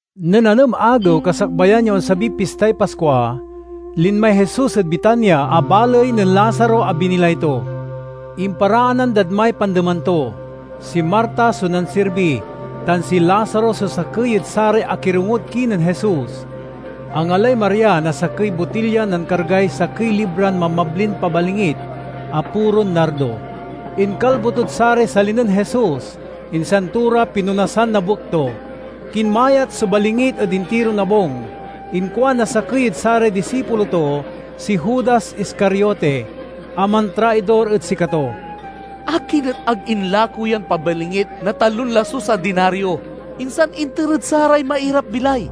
Nen anem agew kasakbayan ya onsabiy pistay Paskua, linmay Jesus ed Betania a baley nen Lazaro a binilay to. Imparaanan dad may pandeman to. Si Marta so nansirbi, tan si Lazaro so sakey ed saray akirongod kinen Jesus. Angalay Maria na sakey botilyan nankargay sakey libran mabmablin pabalingit a puron nardo. Inkalbo tod saray sali nen Jesus, insan to ra pinonasan na buek to. Kinmayat so balingit ed intiron abung. Inkuan na sakey ed saray disipulo to, si Judas Iscariote, a mantraidor ed sikato, "Akin et ag inlako yan pabalingit na talon lasus a dinario, insan inter ed saray mairap-bilay?"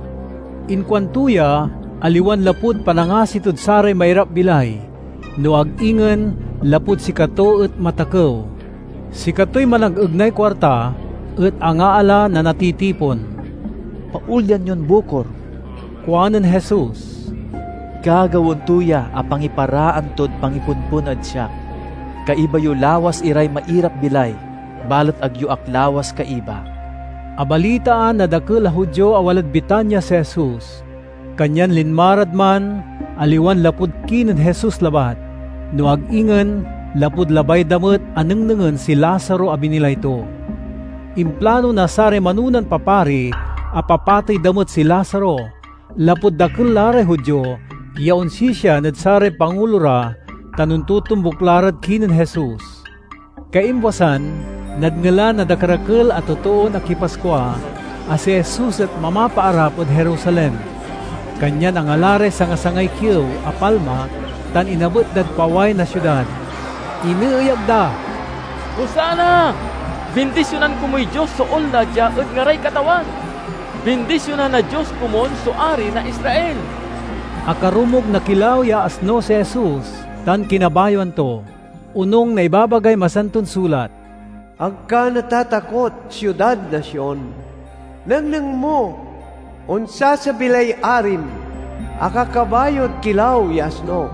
Inkuanto ya, aliwan lapud panangasi tod saray mairapbilay, no ag ingen lapud sikato et matakew. Sikatoy managegnay kuarta et angaala na natitipon. "Paolyan yon bukor!" kuanen Jesus. "Gagawaen to ya a pangiparaan tod pangipompon ed siak. Kaiba yo lawas iray mairap-bilay, balet ag yo ak lawas kaiba." Abalitaan na dakel a Judio a walad Betania si Jesus, kanyan linma rad man aliwan lapud kinen Jesus labat, no ag ingen lapud labay da met a nengnengen si Lazaro a binilay to. Implano na saray manonan papari a papatey da met si Lazaro, lapud dakel la ray Judio ya onsisian ed saray pangulo ra tan ontotombuk la rad kinen Jesus. Kaimbwasan, nadngelan na dakerakel a totoon akipaskua a si Jesus et mamapaarap ed Jerusalem. Kanyan angala ray sanga-sangay kiew a palma tan inabet dad paway na siudad. Ineeyag da, "Hosanna! Bindisionan komuy Dios so onla dia ed ngaray Katawan! Bindisionan na Dios komun so Ari na Israel!" Akarumog na kilaw ya asno si Jesus, tan kinabayoan to, onung na ibabagay Masanton Sulat, "Ag ka natatakot, siudad na Sion! Nengneng mo, onsasabi lay arim, akakabayod kilaw ya asno!"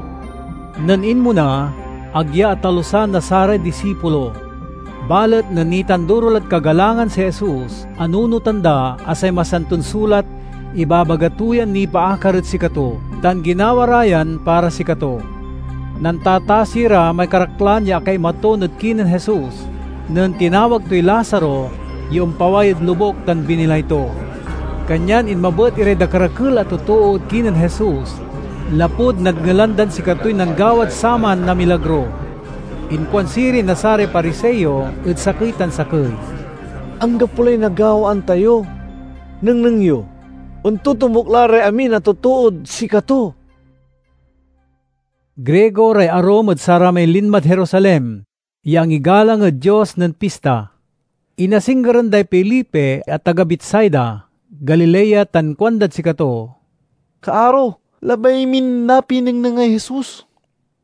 Nen inmona, ag ya atalusan na saray disipulo. Balet nen nitanduro lad kagalangan si Jesus, anunotan da a say Masanton Sulat ibabaga to yan nipaakar ed sikato, tan ginawa ra yan para sikato. Nantatasi ra may karaklan ya akaimaton ed kinen Jesus nen tinawag toy Lazaro ya ompaway ed lobuk tan binilay to. Kanyan inmabet iray dakerakel a totoo ed kinen Jesus lapud nadngelan dan sikatoy nanggawad saman na milagro. Inkuan sirin na saray Pariseo ed sakey tan sakey, "Anggapo lay nagawaan tayo! Nengneng yo, ontotombuk la ray amin a totood sikato!" Grigo ray arum ed saramay linmad Jerusalem ya angigalang ed Dios nen Pista. Inasinggeran day Felipe a taga Betsaida, Galilea, tan kuandad sikato, "Kaaro, labay min napinengnengay Jesus."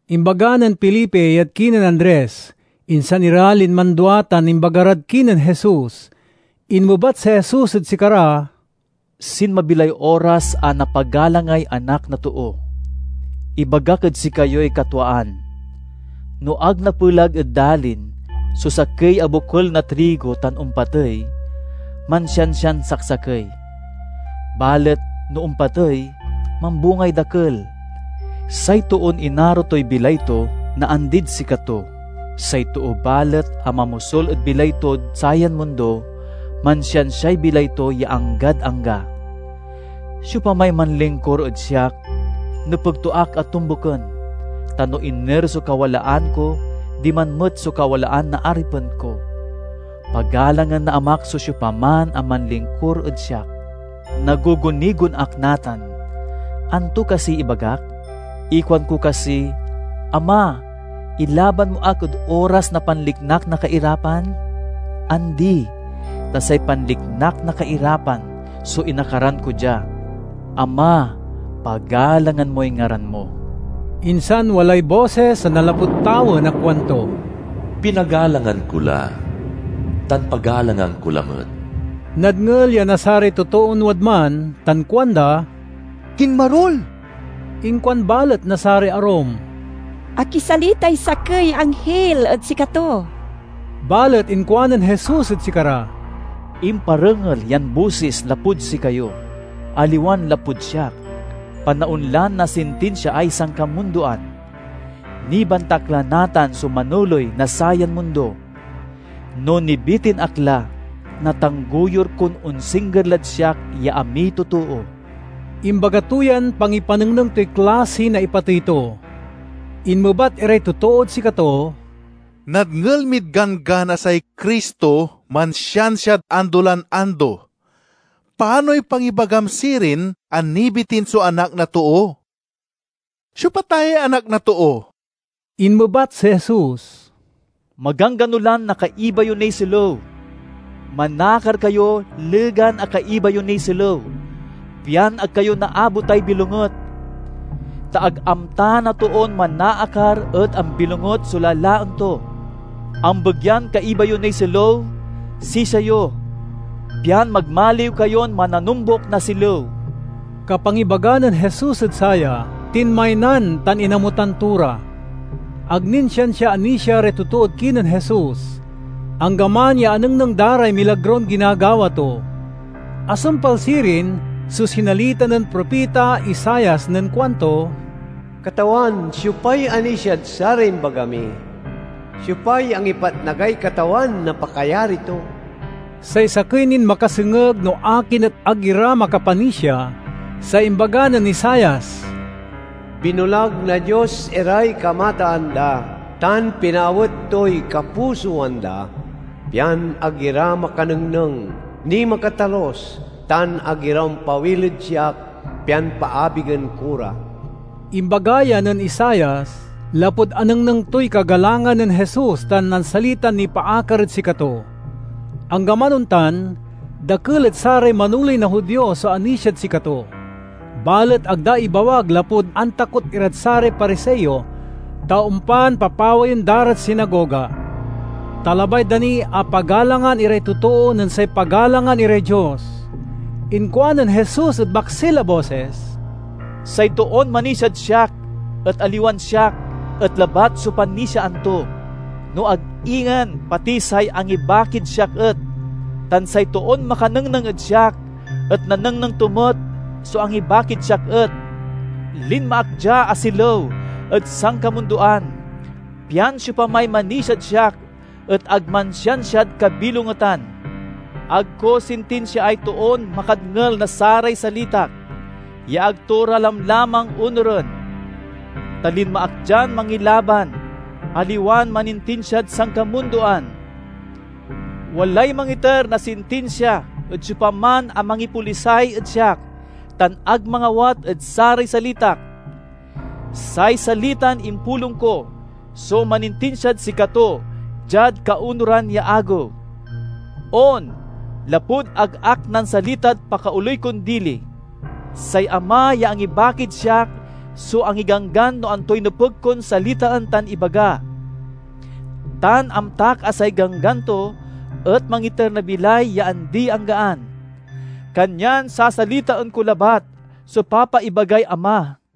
Imbaga nen Felipe yad kinen Andres, insan ira linman dua tan imbaga rad kinen Jesus. Inmebat si Jesus ed sikara, "Sinmabi lay oras a napagalangay Anak na Too. Ibagak ed sikayoy katwaan: no ag napelag ed dalin so sakey a bokel na trigo tan ompatey, mansiansian saksakey. Balet no ompatey, mambungay dakel. Say toon inaro toy bilay to naandid sikato, say too balet a mamosul ed bilay tod sayan mundo, mansiansiay bilay to ya anggad angga. Siopamay manlingkur ed siak, nepeg to ak a tombuken, ta no iner so kawalaan ko diman met so kawalaan na aripen ko. Pagalangan na Amak so siopaman a manlingkur ed siak." "Nagugunigon ak natan; anto kasiy ibagak? Ikuanko kasi, 'Ama, ilaban mo ak ed oras na panliknak na kairapan'? Andi, ta say panliknak na kairapan so inakaran ko dia. Ama, pagalangan moy ngaran mo!" Insan walay bosis a nanlapud tawen a kuanto, "Pinagalangan ko la, tan pagalangan ko lamet." Nadngel ya na saray totoon wadman tan kuanda, "Kinmarul!" Inkuan balet na saray arum, "Akisalitay sakey ya anghil ed sikato!" Balet inkuanen Jesus ed sikara, "Imparengel yan bosis lapud sikayo, aliwan lapud siak. Panaon lan nasintinsiaay sankamundoan. Nibantak la natan so manoley na sayan mundo. No nibitin ak la, natanggoyur kon onsingger lad siak ya amiy totoo." (Imbaga to yan pangipanengneng toy klasi na ipatey to.) Inmebat iray totood sikato, "Nadngel mid Ganggan a say Cristo mansiansiad ando lan ando. Panoy pangibagam sirin a nibitin so Anak na Too? Siopa ta yay Anak na Too?" Inmebat si Jesus, "Maganggano lan nakaiba yo niy silew. Manakar kayo legan a kaiba yo niy silew, pian ag kayo naabotay bilonget. Ta ag amta na toon manaakar ed ambilonget so lalaen to. Ambegyan kaiba yo niy silew sisia yo, pian magmaliw kayon mananombuk na silew." Kapangibaga nen Jesus ed saya, tinmaynan tan inamutan to ra. Ag nin siansia anisia ray totoo ed kinen Jesus, anggaman ya anengneng da ray milagron ginagawa to. Asumpal sirin so sinalita nen propita Isaias nen kuanto: "Katawan, siopay anisiad saray imbaga mi? Siopay angipatnagay Katawan na pakayari to?" Say sakey nin makasengeg no akin et ag ira makapanisia, say imbaga nen Isaias: "Binulag na Dios iray kamataan da, tan pinaawet toy kapusoan da, pian ag ira makanengneng, ni makatalus, tan ag ira ompawil ed siak pian paabigen ko ra." Imbaga ya nen Isaias, lapud anengneng toy kagalangan nen Jesus tan nansalitan nipaakar ed sikato. Anggaman ontan, dakel ed saray manoley na Judio so anisiad sikato. Balet ag da ibawag lapud antakot irad saray Pariseo, ta ompan papawayen da rad sinagoga. Ta labay da ni a pagalangan iray totoo nen say pagalangan iray Dios. Inkuanen Jesus ed maksil a bosis, "Say toon manisiad siak et, aliwan siak et labat so panisiaan to, no ag ingen pati say angibakid siak et. Tan say toon makanengneng ed siak et nanengneng to met so angibakid siak et. Linma ak dia a silew ed sankamundoan, pian siopamay manisiad siak et ag mansiansiad kabilongetan. Ag ko sintinsiaay toon makadngel na saray salitak ya ag to ra lamlamang onuren. Ta linma ak dian mangilaban, aliwan manintinsiad sankamundoan. Walay mangiter na sintinsia ed siopaman a mangipolisay ed siak tan ag mangawat ed saray salitak. Say salitan impulong ko so manintinsiad sikato diad kaonuran ya agew. On, lapud ag ak nansalitad pakaoley kon dili. Say Ama ya angibakid siak so angiganggan no antoy nepeg kon salitaen tan ibaga. Tan amtak a say ganggan to et mangiter na bilay ya andi-anggaan. Kanyan sasalitaen ko labat so papaibagay Ama."